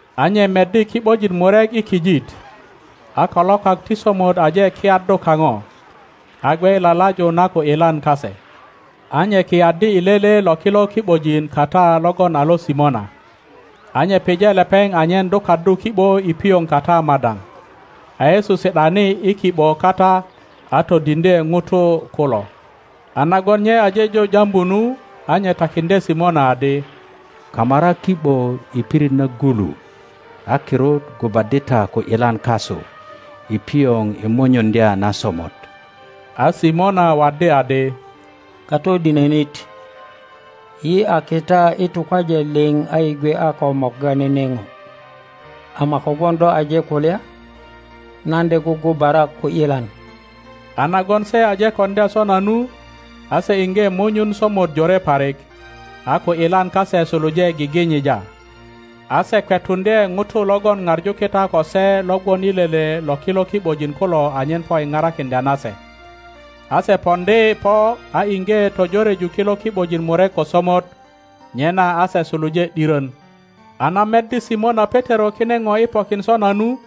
a nye meddi ki ’bojin murek i kijit, a kalokak ti somot aje kiyaddu kaŋo, a gwe i lalaju na ku ’yilan kase. A nye kiyaddi i lele lo kilo ki ’bojin kata logon a lo Simona, a nye pije lepeŋ anyen dukaddu ki ’bo i pioŋ kata madaŋ, a Yesu si ’dani i ki ’bo kata a todiŋdye ŋutu kulo. A nagon nye aje jo jambu nu, a nye takiŋdye Simona adi, Kamara ki ’bo i pirit nagulu a kirut gubaddi ta ku ’yilan kasu i pioŋ i munyuŋdya na somot. A Simona waddi adi, Katodinönit, yi a kita i tukwaje liŋ a yi gwe a ko morga nene ŋo, ama kogwon do aje kulya, nan de gugubara ku ’yilan. A nagon se aje koŋdya sona nu, a se iŋge munyun somot jore parik, a ku ’yilan kase suluje giginyija, a se kwetuŋdye ŋutu logon ŋaŋu kita ko se lo gwon i lele lo kilo ki ’bojin kulo anyen po i parakiŋdya na se. A se poŋdi po a iŋge tojoreju kilo ki ’bojin murek ko somot, nyena a se suluje ’dirön. A na meddi Simona Petero kine ŋo i pokin sona nu,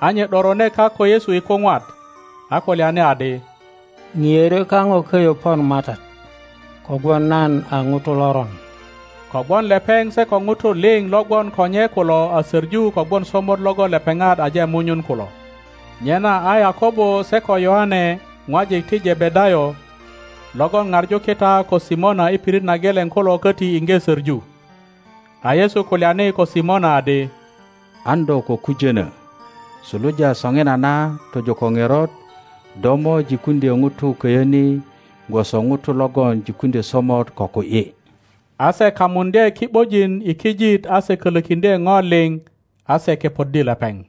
a nye ’dorone kak ko Yesu i kuŋwat, a kulyani adi, ŋiörö kaŋo köyö pon MATAT, kogwon nan a ŋuto loron. Kogwon lepeŋ se ko ŋutu liŋ lo gwon ko nye kulo a soŋu kogwon somot logon lepeŋat aje munyun kulo. Nyena a Yakobo se ko Yoane ŋwajik ti Jebedayo, logon ŋaŋu kita ko Simona i pirit na geleŋ kulo koti iŋge söŋu. A Yesu kulyani ko Simona adi, An do ko kujöno, suluja soŋinana tojo ko ŋerot do mo jikuŋdyö ŋutu köyö ni gwoso ŋuto logon jikuŋdyö somot ko ku ’yi. A se kamuŋdye ki ’bojin i kijit a se kölökiŋdye ŋo liŋ, a se kepoddi lepeŋ.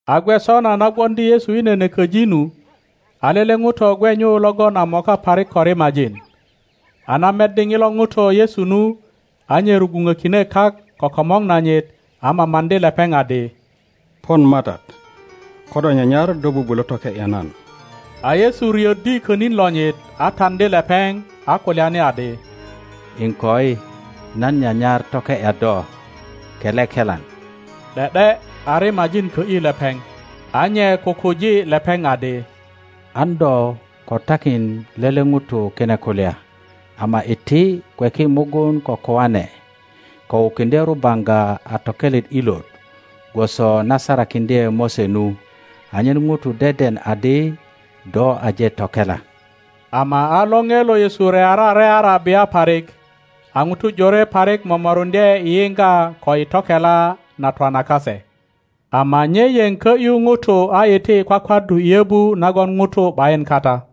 A gwe sona na gwoŋdi Yesu i nene köji nu, a lele ŋuto gwe nyu logon a moka parik ko rimajin; a na meddi ŋilo ŋuto Yesu nu, a nye rugwuŋökine kak ko komor nanyit a mamaŋdi lepeŋ adi, Pon MATAT, ko do nyanyar do bubulö toke ’ya nan. a Yesu riöddi könin lonyit, a taŋdi lepeŋ, a kulyani adi, Iŋkoi, nan nyanyar toke ’ya do; kele kelan. ’De ’de a rimajin kö ’yi lepeŋ. A nye kukuji lepeŋ adi, An do ko takin lele ŋuto kine kulya; ama iti. kweki mugun ko koane, ko wukiŋdye rubaŋga a tokelet ilot gwoso na sarakiŋdye Mose nu, anyen ŋutu deden adi do aje tokela. Ama a lore lo Yesu reara reara bia parik; a ’ŋutu jore parik momoruŋdye i yiŋga ko i tokela na twana kase. Ama nye yeŋ kö ’yu ŋutu a iti i kwakwaddu i yöbu nagon ŋutu ’bayin kata.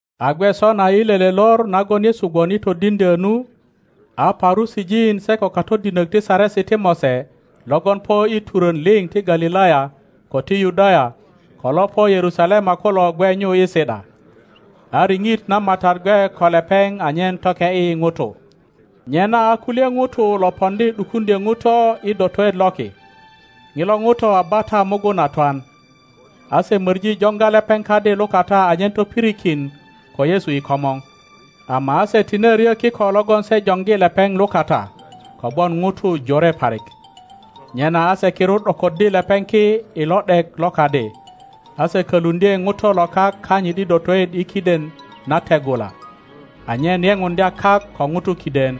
A gwe sona i lele lor nagon Yesu gwon i todiŋdyö nu, a Parusijin se ko katodinök ti Saresi ti Mose logon po i turön liŋ ti Galilaya, ko ti Yudaya, ko lo po Yerusalema kulo gwe nyu i si ’da. A riŋit na MATAT gwe ko lepeŋ anyen toke ’yi ŋutu. Nyena a kulye ŋutu lo poŋdi ’dukuŋdyö ŋuto i dotoet loki. ŋilo ŋuto a bata mugun a twan. A se möŋi joŋga lepeŋ kadi lukata anyen topirikin ko Yesu i komor, ama a se tine ryö kiko logon se joŋgi lepeŋ lukata, kogwon ŋutu jore parik. Nyena a se kirut ’dokoddi lepeŋ ki i lo ’dek lo kadi, a se köluŋdye ŋuto lo kak kanyit i dotoet i kiden na teŋula, anyen yepuŋdya kak ko ŋutu kiden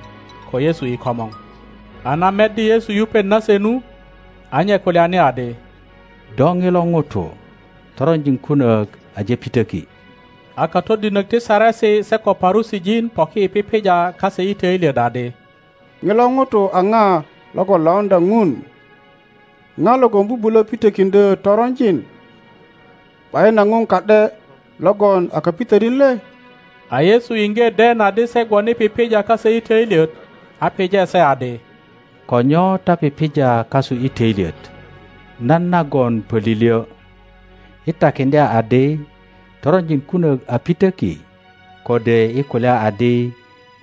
ko Yesu i komor. a na meddi Yesu yupet nase nu, a nye kulyani adi, Do ŋilo ŋuto, toronjin kunök aje pitöki. a katodinök ti Saresi se ko Parusijin poki i pipija kase i töilyet adi, ŋilo ŋuto a ŋa lo lauŋdya ŋuri? ŋa logon bubulo pitökiŋdyö toronjin? ’Bayin a Ŋun ka ’de logon a kapitönit le? a Yesu iŋge den adi se gwon i pipija kase i töilyet, a pije se adi, Ko nyo ta pipija kasu i töilyet? Nan nagon pölilyö, i takiŋdya adi, Toronjin kunök a pitöki, kode i kulya adi,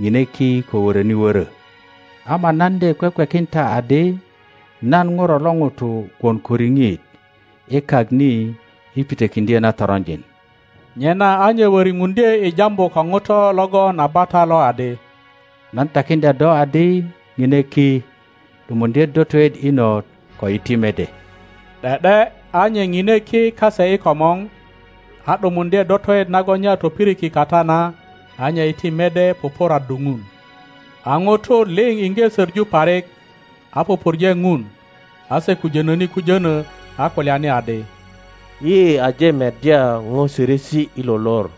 ŋine ki ko wöröni wörö? Ama nan de kwekwekin ta adi nan ŋuro lo ŋuto gwon ko riŋit i kak ni i pitökiŋdyö na toronjin. Nyena a nye wöripuŋdye i jambu ko ŋuto logon a bata lo adi, Nan takiŋdya do adi, Ŋine ki, ’dumuŋdye dotoet inot, ko iti mede. ’De ’de a nye ŋine ki kase i komor, a ’dumuŋdye dotoet nagon nye a topiriki kata na, a nye iti mede pupuraddu Ŋun. a ŋutu liŋ iŋge söŋu parik, a pupurje Ŋun; a se kujönöni kujönö, a kulyani adi, Yi aje meddya ŋo sörösi i lo lor.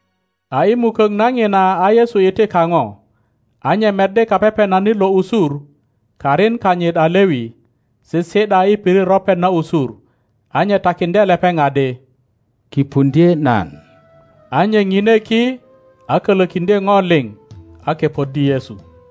A i mukök na ŋina a Yesu iti kaŋo, a nye meddi kapepenanit lo usur, karin kanyit a Lewi, sisi ’da i pirit ropet na usur, a nye takiŋdye lepeŋ adi, Kipundye nan. a nye ŋine ki, a kölökiŋdye ŋo liŋ, a kepoddi Yesu.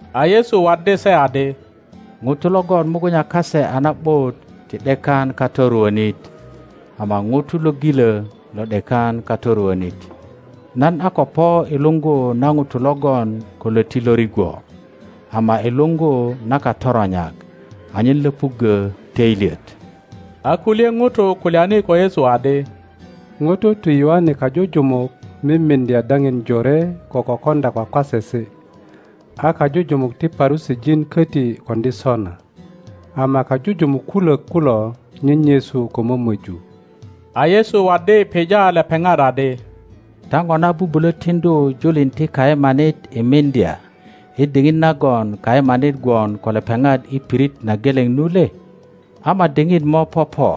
A Yesu waddi se adi, Ŋutu logon mugunya kase a na ’but ti ’dekan katoruönit, ama ŋutu lo gilö lo ’dekan katoruönit; nan a ko po i luŋgu na ŋutu logon ko löti lo rigwo, ama i luŋgu na katoronyak anyen löpuggö töilyet. A kulye ŋutu kulyani ko Yesu adi, Ŋutu ti Yoane kajujumuk mimiŋdya daŋin jore ko kokoŋdya kwakwasesi, a kajujumuk ti Parusijin köti koŋdi sona, ama kajujumuk kulök kulo nyenyesu ko mömöju. A Yesu waddi pija lepeŋat adi, Ta ŋona bubulö tiŋdu julin ti kayemanit i miŋdya i diŋit nagon kayemanit gwon ko lepeŋat i pirit na geleŋ nu le? Ama diŋit mo popo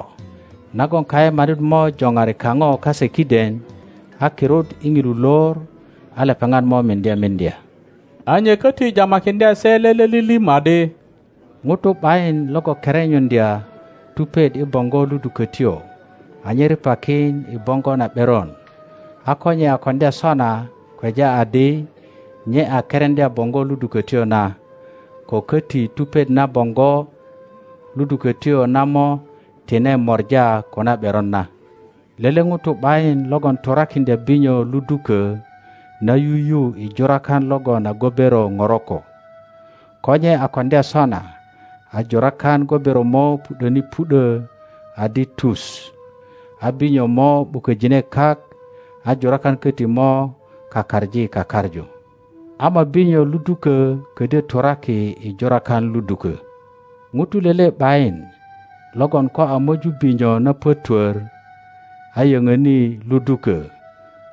nagon kayemanit mo joŋari kaŋo kase kiden, a kirut i ŋilu lor a lepeŋat mo miŋdye miŋdya. a nye köti jamakiŋdye se lele lilim adi, Ŋuto ’bayin logon kerenyuŋdya tupet i boŋgo ludukötyo anyen ripakin i boŋgo na ’beron; a ko nye a koŋdya sona kweja adi nye a kereŋdya boŋgo ludukötyo na, ko köti tupet na boŋgo ludukötyo na mo tine mora ko na ’beron na. Lele ŋuto ’bayin logon turakiŋdya binyo ludukö na yuyu i jurakan logon a gobero ŋoroko; ko nye a koŋdya sona, a jurakan gobero mo pu ’döni pu ’dö adi tu, a binyo mo ’buköjine kak a jurakan köti mo kakaŋi kakaŋu. Ama binyo ludukö ködyö turaki i jurakan ludukö. Ŋuto lele ’bayin logon ko a möju binyo na pötwör, a yöŋöni ludukö,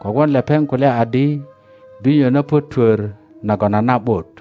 kogwon lepeŋ kulya adi, Binyo na pötwör nagon a na ’but.